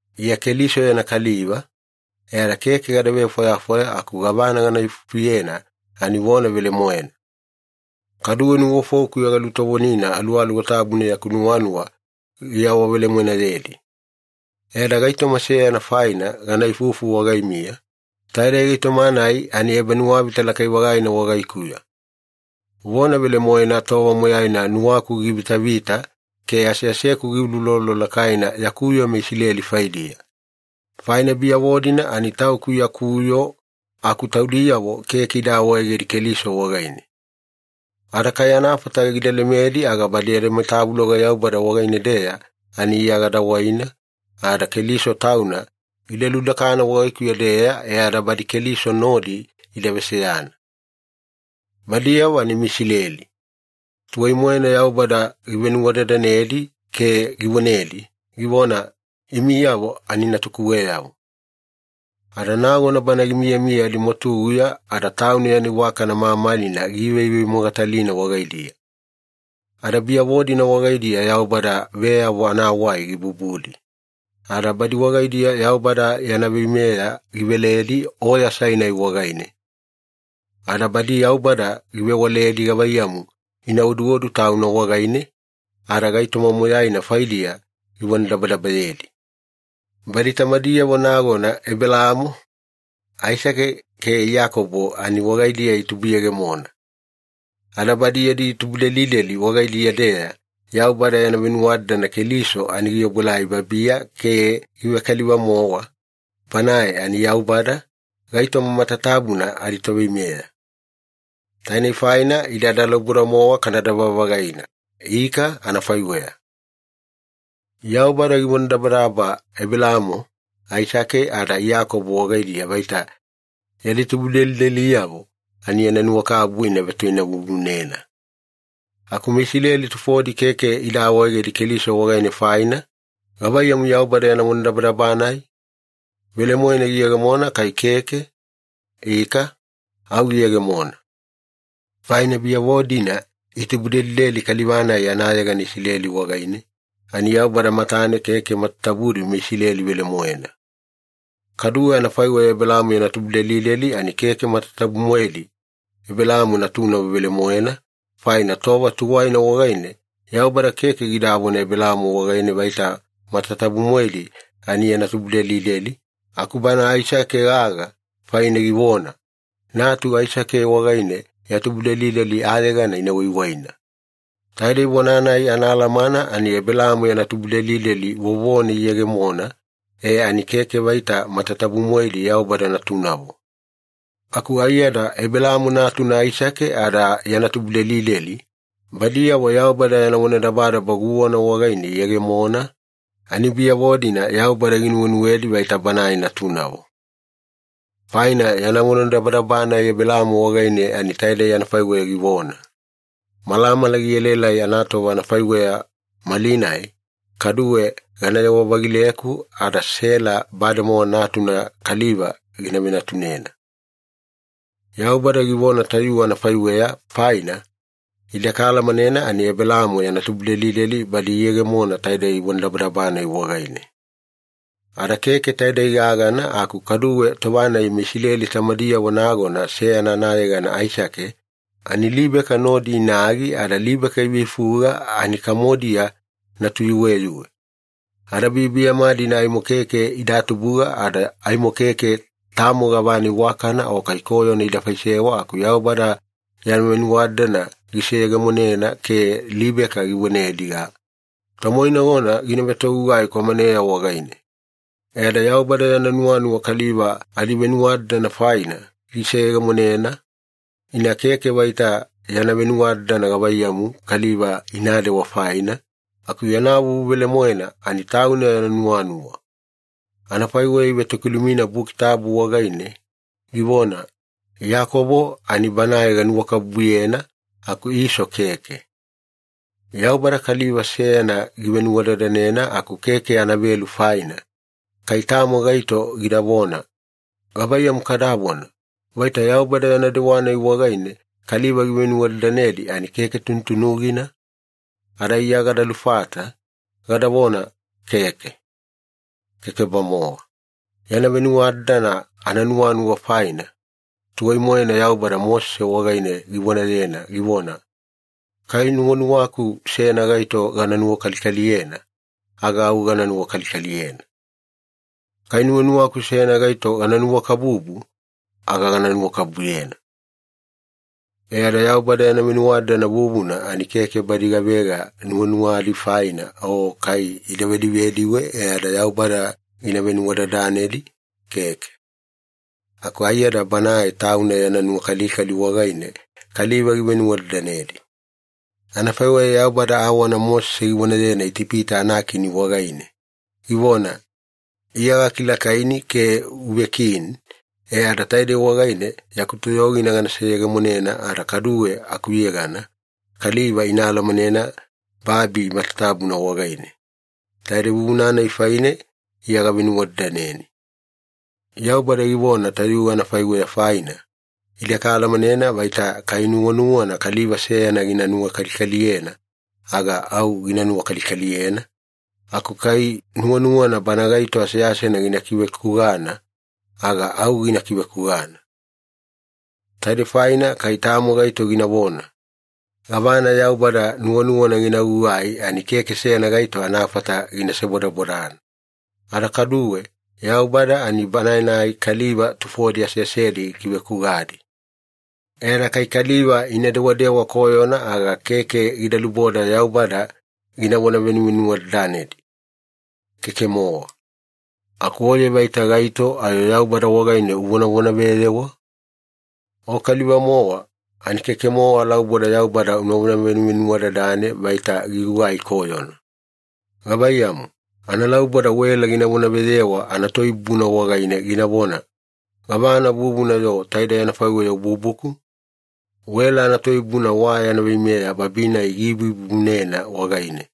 Iya Keliso yana kaliva, e ada keke gada vefwayafwaya aku gavana gana ifufuyena ani vona velemoena. Kaduwe nuwafoukuya galutovonina Aluwaluwa Tabuna yaku nuwanuwa giawavelemoenayedi. E ada gaitoma seyana faina gana ifufu wagaimiya, taidei gaitoma-nai ani ebanuwavita lakai-vagaina wagaikuya. Vona velemoena tova moyaina nuwaku givitavita ke aseaseku giuloulolo lakaina yaku yoo meIsileli faidiya. Faina biyavo-dina ani tauku yaku yoo aku taudiyavo keke ida awaegedi Keliso wagaine. Ada kai anafata gida lemedi aga badi adimatavuloga Yaubada wagaine-deya ani Iya gada waina ada Keliso Tauna gida ludakana wagaikuya-deya e ada badi Keliso nodi ida veseyana. Badiyavo ani meIsileli. Tuwai-moena Yaubada givenuwadadanedi ke givonedi, givona, “Imiyavo ani natukuweyavo.” Ada nagona Bana gimiyamiya adimwatuguya ada Tauna yana iwakana mamalina giivevemogatalina wagaidiya. Ada biyavo-dina wagaidiya Yaubada veyavo anawai gibubudi. Ada badi wagaidiya Yaubada yana veimeya giveledi Oya Sainai wagaine. Ada badi Yaubada givewaledi gavaiyamu ina oduodu Tauna wagaine, ada gaitoma moyaina faidiya givonadabadabayedi. Badi tamadiyavo nagona Ebelaamo, Aisake ke Iyakobo ani wagaidiya itubuyegemona. Ada badi yadi tubudelideli wagaidiya-deya Yaubada yana venuwadadana Keliso ani giobuelai babiya ke givekaliva-mowa, Banae ani Yaubada, gaitoma matatabuna adiToveimeya. Tainei faina ide analauboda-mowa kana dava-vagaina. Ika, anafaiweya. Yaubada givonadabadaba Ebelaamo, Aisake ada Iyakobo wagaidiya vaita yadi tubudelideliyavo ani yana awanuwakabubu ina vetoinavuvunena. Aku meIsileli tufodi keke ida awaegedi Keliso wagaine faina, gavaiyamu Yaubada yana vonadabadaba-nai? Velemoena giyegemona kai keke? Ika, au giyegemona. Faina biyavo-dina itubudelideli kaliva-nai anayegana Isileli wagaine ani Yaubada matane keke matatabudi meIsileli velemoena. Kaduwe anafaiweya Ebelaamo yana tubudelideli ani keke matatabu-moedi Ebelaamo natunavo velemoena, faina tova tuwaina wagaine Yaubada keke gidavona Ebelaamo wagaine vaita matatabu-moedi ani yana tubudelideli, aku bana Aisake gagana faine givona, “Natu Aisake wagaine ya tubudelideli ayegana ina waiwaina.” Taidei vona-nai anaalamana ani Ebelaamo yana tubudelideli vovone iyegemona e ani keke vaita matatabu-moedi Yaubada natunavo. Aku aiyada Ebelaamo natuna Aisake ada yana tubudelideli, badiyavo Yaubada yana vonadabadaba guwana wagaine iyegemona ani biyavo-dina Yaubada ginuwenuwedi vaita Banae natunavo. Faina yana vonadabadaba-nai Ebelaamo wagaine ani taidei anafaiweya givona, “Malamala gielaelai anatova anafaiweya malinai, kaduwe ganayewa-vagileku ada Sela bademowa natuna kaliva gina venatunena.” Yaubada givona tayuwe anafaiweya faina, ide kaalamanena ani Ebelaamo yana tubudelideli badi iyegemona taidei vonadabadaba-nai wagaine. Ada keke taidei gagana aku kaduwe tova-nai meIsileli tamadiyavo nagona seyana anayegana Aisake ani Libeka nodi inagi ada Libeka iveifuga ani kamodiya natuyuweyuwe. Ada biyabiyama-dina aimo keke ida tubuga ada aimo keke tamo gavana iwakana o kai koyona ida faisewa, aku Yaubada yana venuwadadana giseyegemonena ke Libeka givonediga, “Tomoinagona gina vetogugai kwamaneya wagaine.” E ada Yaubada yana nuwanuwa kaliva adivenuwadadana faina giseyegemonena, ina keke vaita yana venuwadadana gavaiyamu kaliva inadewa faina, aku yana vuvu velemoena ani Tauna yana nuwanuwa. Anafaiweya ivetokilumina Buki Tabu wagaine, givona, “Iyakobo ani banae ganuwakabubuyena, aku Iso keke.” Yaubada kaliva seyana givenuwadadanena aku keke anavelu faina, kai tamo gaito gidavona, “Gavaiyamu kadavona, vaita Yaubada yana dewa-nai wagaine kaliva givenuwadadanedi ani keke tunutunugina?” Ada Iya gada lufata, gadavona, “Keke. Keke-bamowa. Yana venuwadadana ananuwanuwa faina, tuwai-moena Yaubada Mosese wagaine givonayena, givona, ‘Kai nuwanuwaku seyana gaito gana nuwakalikaliyena, aga au gana nuwakalikaliyena. Kai nuwanuwaku seyana gaito gana nuwakabubu, aga gana nuwakabubuyena.’” E ada Yaubada yana venuwadadana vuvuna ani keke badi gavega nuwanuwadi faina o kai ida vedivediwe e ada Yaubada gida venuwadadanedi, keke. Aku aiyada Banae Tauna yana nuwakalikali wagaine kaliva givenuvenuwadadanedi. Anafaiweya Yaubada awana Mosese givonayena Itipita anakini wagaine, givona, “Iya gakilakaini ke uvekini e ada taidei wagaine yaku toyogina gana seyegemonena, ada kaduwe akuyegana kaliva ina alamanena babi matatabuna wagaine. Taidei vuvuna-nai faine Iya gavenuwadadaneni.” Yaubada givona tayuwe anafaiweya faina, ide kaalamanena vaita kai nuwanuwana kaliva seyana gina nuwakalikaliyena, aga au gina nuwakalikaliyena, aku kai nuwanuwana bana gaito aseasena gina kivekugana, aga au gina kivekugana. Taidei faina kai tamo gaito ginavona, “Gavana Yaubada nuwanuwana gina gugai ani keke seyana gaito anafata gina sebodabodana. Ada kaduwe, Yaubada ani Banae-nai kaliva tufodi aseasedi gikivekugadi. E ada kai kaliva ina dewadewa koyona aga keke gida luboda Yaubada ginavona venuvenuwadadanedi. Keke-mowa.” Aku oye vaita gaito ayo Yaubada wagaine uvonavonaveyewa? O kaliva-mowa ani keke-mowa alauboda Yaubada unavona venuvenuwadadane vaita gigugai koyona. Gavaiyamu, analauboda wela gina vonaveyewa anatoibubuna wagaine ginavona, “Gavana vuvuna-yo taidei anafaiweya ububuku?” Wela anatoibubuna wa yana veimeya babi-nai giibuibubunena wagaine.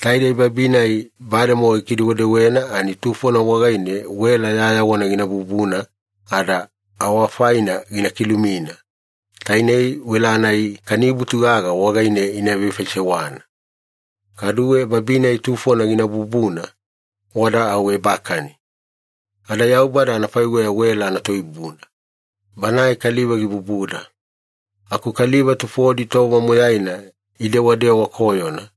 Taidei babi-nai bademowa gikidewedewena ani tufona wagaine wela yayawana gina bubuna ada awafaina gina kilumina, tainei wela-nai kanibutu gaga wagaine ina vefaisewana. Kaduwe babi-nai tufona gina bubuna, wada au ebakani. Ada Yaubada anafaiweya wela anatoibubuna. Banae kaliva gibubuda. Aku kaliva tufodi tova moyaina idewadewa koyona,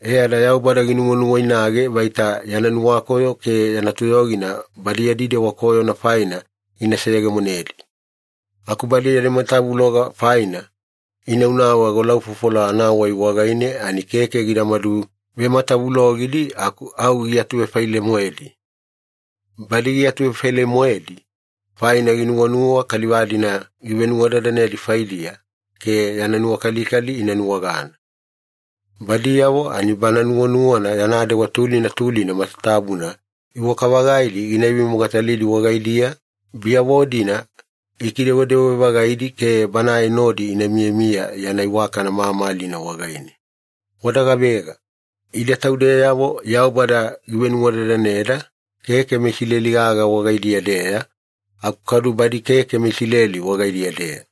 e ada Yaubada ginuwanuwainage vaita yana nuwakoyo ke yana toyogina badi yadi dewa koyona faina gina seyegemonedi. Aku badi adimatavuloga faina inaunau agolaufofola anawai wagaine ani keke gidamadu vematavulogidi aku au giatuvefaile-moedi. Badi giatuvefaile-moedi, faina ginuwanuwa kaliva-dina givenuwadadanedi faidiya ke yana nuwakalikali ina nuwagana. Badiyavo ani Bana nuwanuwana yana dewa tulina tulina matatabuna iwaka-vagaidi gina ivemogatalidi wagaidiya, biyavo-dina gikidewedewe-vagaidi ke Banae nodi ina miyamiya yana iwakana mamalina wagaine. Wada gavega? Ide taudeyavo Yaubada givenuwadadaneda, keke meIsileli gagana wagaidiya-deya aku kaduwe badi keke meIsileli wagaidiya-deya.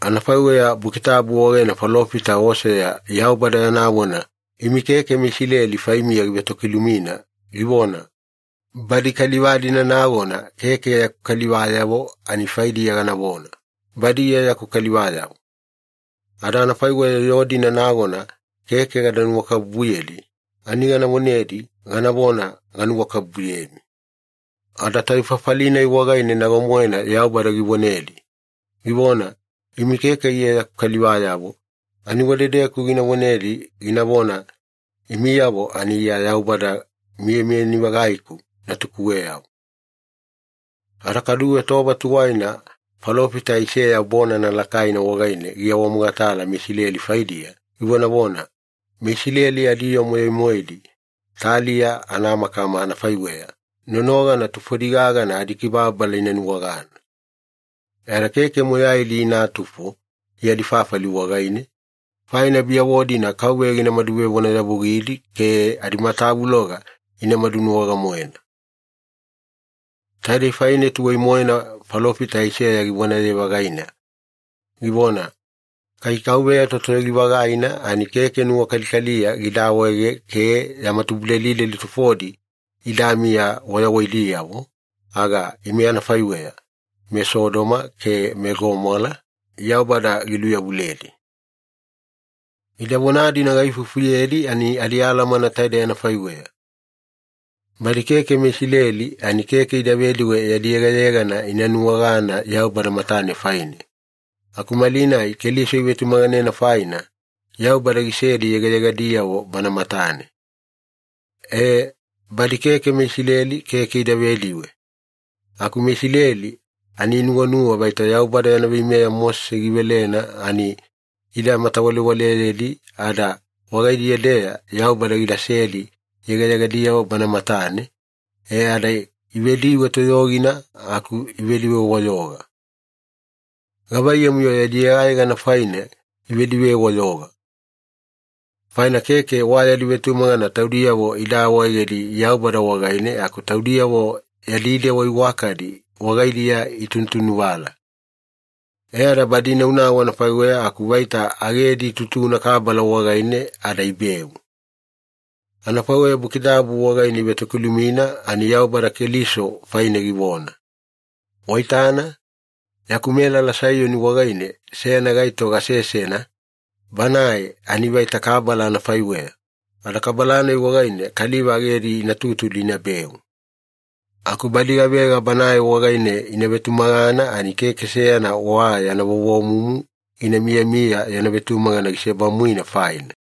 Anafaiweya Buki Tabu wagaine falofita Oseya Yaubada yana vona imi keke meIsileli faimiya givetokilumina, givona, “Badi kaliva-dina nagona keke yaku kalivayavo ani faidiya ganavona, ‘Badi Iya yaku kalivayavo.’ Ada anafaiweya yoo-dina nagona keke gada nuwakabubuyedi, ani gana vonedi ganavona, ‘Ganuwakabubuyemi.’” “Ada tayuwe fafali-nai wagaine nago-moena Yaubada givonedi, givona, ‘Imi keke Iya yaku kalivayavo’ ani wadedeku gina vonedi ginavona, ‘Imiyavo ani Iya Yaubada miyamiyani-vagaiku natukuweyavo.’” Ada kaduwe tova tuwaina falofita Aiseya bonana lakaina wagaine giawamogatala meIsileli faidiya, givonavona, “MeIsileli adiyoo moyai-moedi taliya anamakama anafaiweya nonogana tufodi gagana adikibababala ina nuwagana. E ada keke moyaidi inatufo yadi fafali wagaine, faina biyavo-dina KAUVEYA ginamadu vevonayavugidi ke adimatavuloga ina madunuwaga-moena.” Taidei faine tuwai-moena falofita Aiseya givonaye-vagaina, givona, “Kai KAUVEYA Totoyogi-vagaina ani keke nuwakalikaliya gida awaega ke yama tubudelideli tufodi idamiya wayawaidiyavo, aga ime anafaiweya meSodoma ke meGomola, Yaubada giluyavuledi.” Ida vona-dina gaifufuyedi ani adialamana taidei anafaiweya. Badi keke meIsileli ani keke ida vediwe yadi yegayegana ina nuwagana Yaubada matane faine, aku malinai Keliso ivetumaganena faina, Yaubada gisedi yegayegadiyavo Bana matane. E, badi keke meIsileli keke ida vediwe, aku meIsileli ani inuwanuwa vaita Yaubada yana veimeya Mosese givelena ani ida matawalewaleyedi ada wagaidiya-deya Yaubada gidasedi yegayegadiyavo Bana matane, e ada ivediwe toyogina aku ivediwe-wayoga. Gavaiyamu-yo yadi yegayegana faina ivediwe-wayoga? Faina keke wa yadi vetumagana taudiyavo ida awaegedi Yaubada wagaine aku taudiyavo yadi dewa iwakadi wagaidiya itunutunuvala. E ada badi inaunau anafaiweya aku vaita agedi itutuna kabala wagaine ada ibeu. Anafaiweya Buki Tabu wagaine ivetokiluma ani Yaubada Keliso faine givona, “Waitana, yaku melala Saiyoni wagaine seyana gaito gasesena, Banae ani vaita kabala anafaiweya, ada kabala-nai wagaine kaliva agedi ina tutudi inabeu. Aku badi gavega Banae wagaine ina vetumagana ani keke seyana wa yana vovomumu gina miyamiya yana vetumagana gisebamuina faina.”